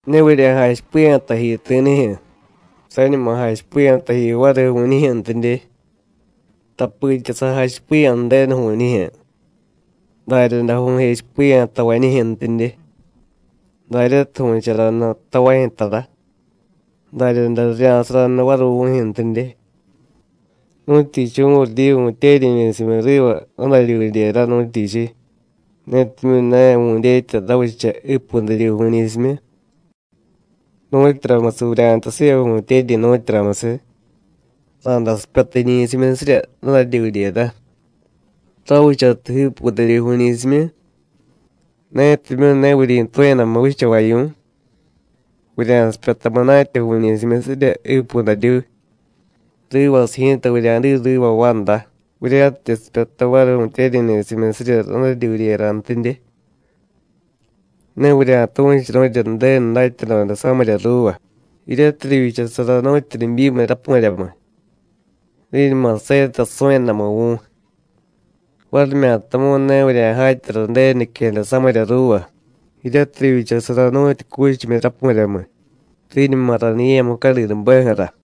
“Ne vurya̱jachipiya̱ taji ti̱nijyu̱, sañuma jachipiya̱ taji variy vu̱ñijyu̱ntidye. Tapitya sa̱jachipiya̱ Ju̱denu vu̱ñijyu̱, daryaday vu̱jechipiya̱ tavañijyu̱ntidye. Daryatiy vu̱charanu tavajyu̱ tara, daryaday rirya̱saranu variy vu̱jyu̱ntidye. ¿Nu̱tyichiy vu̱ryidyi vu̱tyeryi̱ ni̱simyu riva radaryudyera, nu̱tyichiy? netimyu̱ ne vu̱dyetya ravicha jiipudaryuy vu̱ñi̱simyu. ¿Nu̱tyuramusiy vurya̱jtay siva vu̱tyeryi̱, nu̱tyuramusiy? Ra̱day sipyata jiñi̱simyusirya radaryudyera, ravichatiy jiipudaryuy vu̱ñi̱simyu. Netimyu̱ ne vuryi̱tu̱yadamu vichavavyu̱y, vurya̱sipyata munatya vu̱ñi̱simyusirya jiipudaryuy, rivasiy ji̱ta vurya̱diy riva vanda, vurya̱tidye sipyata variy vu̱tyeryi̱ ni̱simyusirya radaryudyerantidye. Ne vurya̱tu̱churu̱rya Ju̱denu datyadoda samirya ruuva, jiryatiy rivyichasara nu̱tyu nibyimiy rapu̱ryamiy, riñuma seta su̱yadamu vu̱y; varimyatamu̱y ne vurya̱jatyara Ju̱denu niquejada samirya ruuva, jiryatiy rivyichasara nu̱tyu cuchimyi rapu̱ryamiy, riñuma raniye̱ mucadinubeju̱ra.”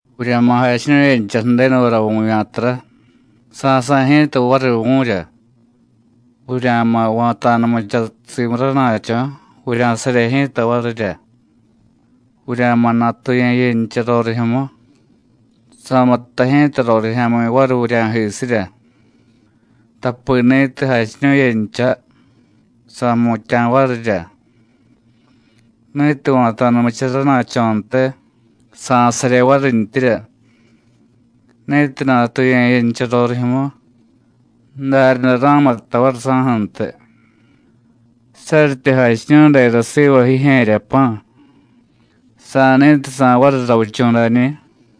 “Vurya̱ma̱ jachiñu̱yencha Ju̱denuvara vu̱vya̱tara, sa̱sa̱y ji̱ta variy vu̱rya; vurya̱ma̱ va̱ta̱numucha simu rana̱cho̱, vurya̱sarye ji̱ta varirya; vurya̱ma̱ natuye̱yencha rorijyu̱mu, sa̱muttay ji̱ta rorijya̱mi̱ variy vurya̱jisirya. Tapi ni̱tiy jachiñu̱yencha, sa̱jmutya̱ varirya; ni̱tiy va̱ta̱numucha rana̱cho̱ntiy, sa̱sarye varintyirya; ni̱tiy natuye̱yencha rorijyu̱mu, daryaday ra̱muttay variy saju̱ntiy. Saryityi jachiñu̱y dera siva jijye̱rya pa̱, ¿sa̱ni̱tiy sa̱y variy ravichu̱ dañi̱?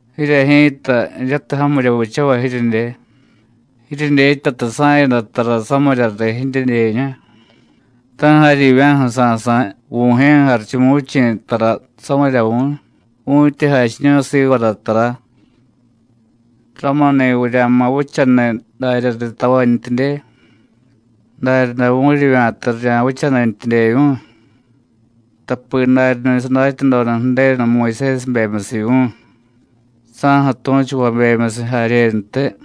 Jirye ji̱ta, jiryatiy jamirya vichavay jiryedye, jiryedyetyatiy sa̱yada tara samirya riy jidyedyeñu, ta̱ jaryivya̱ju̱ sa̱sa̱y Vu̱jye̱ Jarichumuvichi̱ tara samirya vu̱y vu̱tyi jachiñu̱y sivara tara. Ramuni̱ vurya̱ma̱ vichaniy darya riy tavantyidye, daryaday vu̱ryivya̱ta rirya̱vichanintyidyevyu̱y, tapi daryani̱ sadatyadoda Ju̱denu Muyusésibemyusiy vu̱y, saju̱ tu̱chuvabemyusiy jaryentiy.”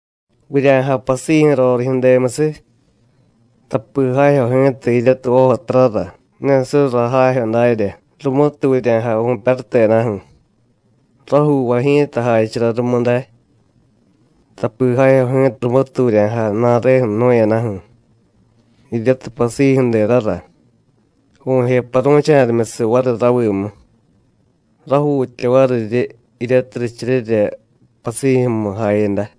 “Vurya̱jay pasijyu̱ rorijyu̱demusiy; tapi jajyo ji̱ta jiryatiy vojotarara, ne surra jajyo darya, rumutiy vurya̱jay vu̱pyarutedaju̱. Rajuuvay ji̱ta jachara rumu day. Tapi jajyo ji̱ta rumutiy vurya̱jay ju̱na̱re jnu̱yadaju̱, jiryatiy pasijyu̱derara, vu̱je paru̱cha̱rimyusiy variy ravimu. Rajuutya variryi jiryatiy richeryera pasijyu̱mu jayada.”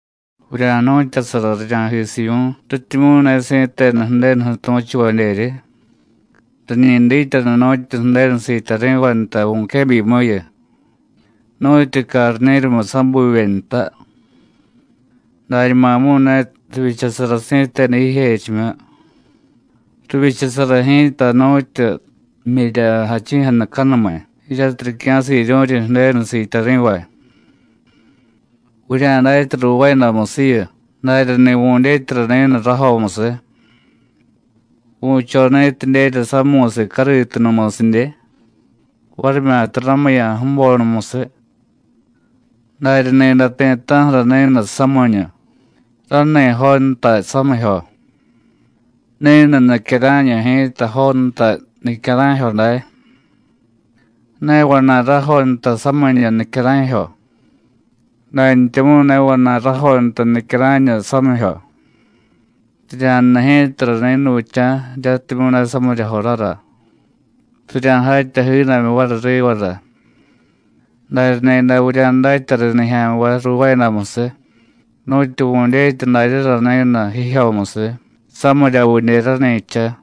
“Vurya̱jnu̱tyasara rirya̱jisivyu̱y, rityimyu̱ ne si̱tenu Ju̱denuju̱ tu̱chuvadyeryi. Riñi dityanu nu̱tyu Ju̱denu siityari̱vay nta vu̱quebyimuyu, nu̱tyu carni̱rumiy sabuvye nta. Dañumamu̱y ne rivyichasara si̱tenu jijechimyu. Rivyichasara ji̱ta nu̱tyu jmyirya jachi̱jadacanumiy, jiryatiy ricya̱siryu̱ryi Ju̱denu siityari̱vay. Vurya̱datya ruuvaayadamusiyu, daryani̱ vu̱dyetyara ni̱nu rajomusiy. ¿Vu̱cho ni̱tidyerya samu̱siy cariitunumusidye? ¿varimyata ramuya̱ ju̱bonumusiy? Darya ni̱day ti̱ta̱ju̱ra ni̱nu samiñu, rani jontay samijyo; ni̱nu nicyara̱ñu ji̱ta jontay nicyara̱jyo day. Ne vana̱y rajontay samiñu, nicyara̱jyo; dantyamu̱y ne vana̱y rajontay nicyara̱ñu, samijyo. Rirya̱jnu ji̱tara ni̱nuvicha̱ jiryatimyu̱ ne samirya jorara, rirya̱jatya jiidamyu variy rivara. Darya ni̱day vurya̱datya riy nijya̱nvay ruuvaayadamusiy, nu̱tyu vu̱dyetya daryara ni̱nu jijyomusiy, samiryavidye rani̱cha.”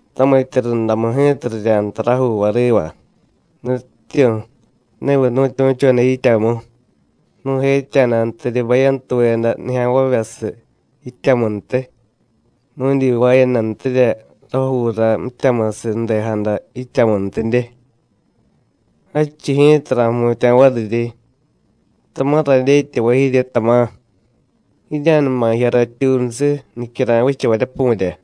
Tamitya rundamu ji̱ta rirya̱jtay rajuuvay riva: Nutyityu̱, ¿neviy nu̱tyu̱choda yityamu, nu̱jetya̱dantiryi bayantuveda nijya̱nvavyasiy yityamuntiy, nu̱dyivaayadantirya rajuura mityamusiy ju̱dejada yityamuntidye? Jadchiy ji̱ta ra̱jmutya̱ variryi: ¡Tama̱ radyetyavay jirye, tama̱; jirya̱numa jiya ratyuunusiy, nicyara̱y vichavaryapu̱rya!”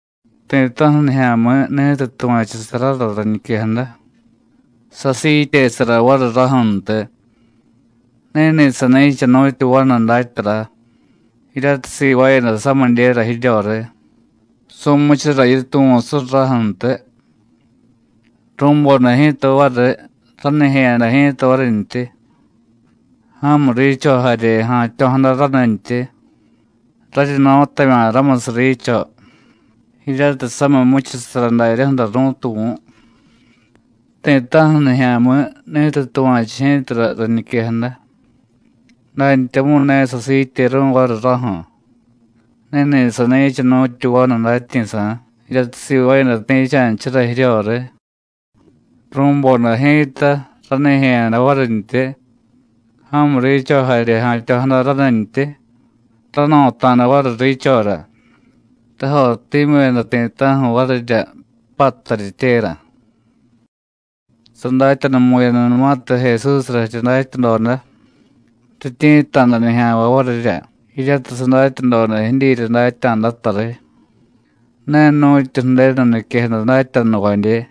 “Ti̱ta̱ju̱ nijya̱mi̱ ni̱tiy tuva̱chusarara rañiquejada, sasiityesara variy raju̱ntiy, ni̱ni̱ sani̱cha nu̱tyu vanu datyara jiryatiy sivaayada samidyera jiryoriy, su̱muchura yituvu̱ surraju̱ntiy. Ru̱boda ji̱ta variy, ranijye̱yada ji̱ta varintyi. Ja̱mu riicho jarye ja̱tyo̱jada ranintyi, raryi no̱tavya̱ ramusiy riicho, jiryatiy samiy jmuchusara daryaju̱ra ru̱tuvu̱. Ti̱ta̱ju̱ nijya̱mi̱ ni̱tiy tuva̱chu ji̱tara rañiquejada, dantyamu̱y ne sasiityeru̱y variy raju̱, ni̱ni̱ sani̱cha nu̱tyu vanu datyi̱sa̱ jiryatiy sivaayada ti̱cha̱nchara jiryoriy. Ru̱boda ji̱ta, ranijye̱yada varintyi, ja̱mu riicho jarye ja̱tyo̱jada ranintyi, rano̱ta̱da variy riichora, rajottimyu̱yada ti̱ta̱ju̱ varirya, pattaryityera.” Sadatyanumu̱yadanumatiy Jesúsra jirya datyadoda, rityi̱tta̱da nijya̱nvay varirya jiryatiy sadatyadoda jidyirya datya̱data riy, ne nu̱tyu Ju̱denu niquejada datyanuvadye.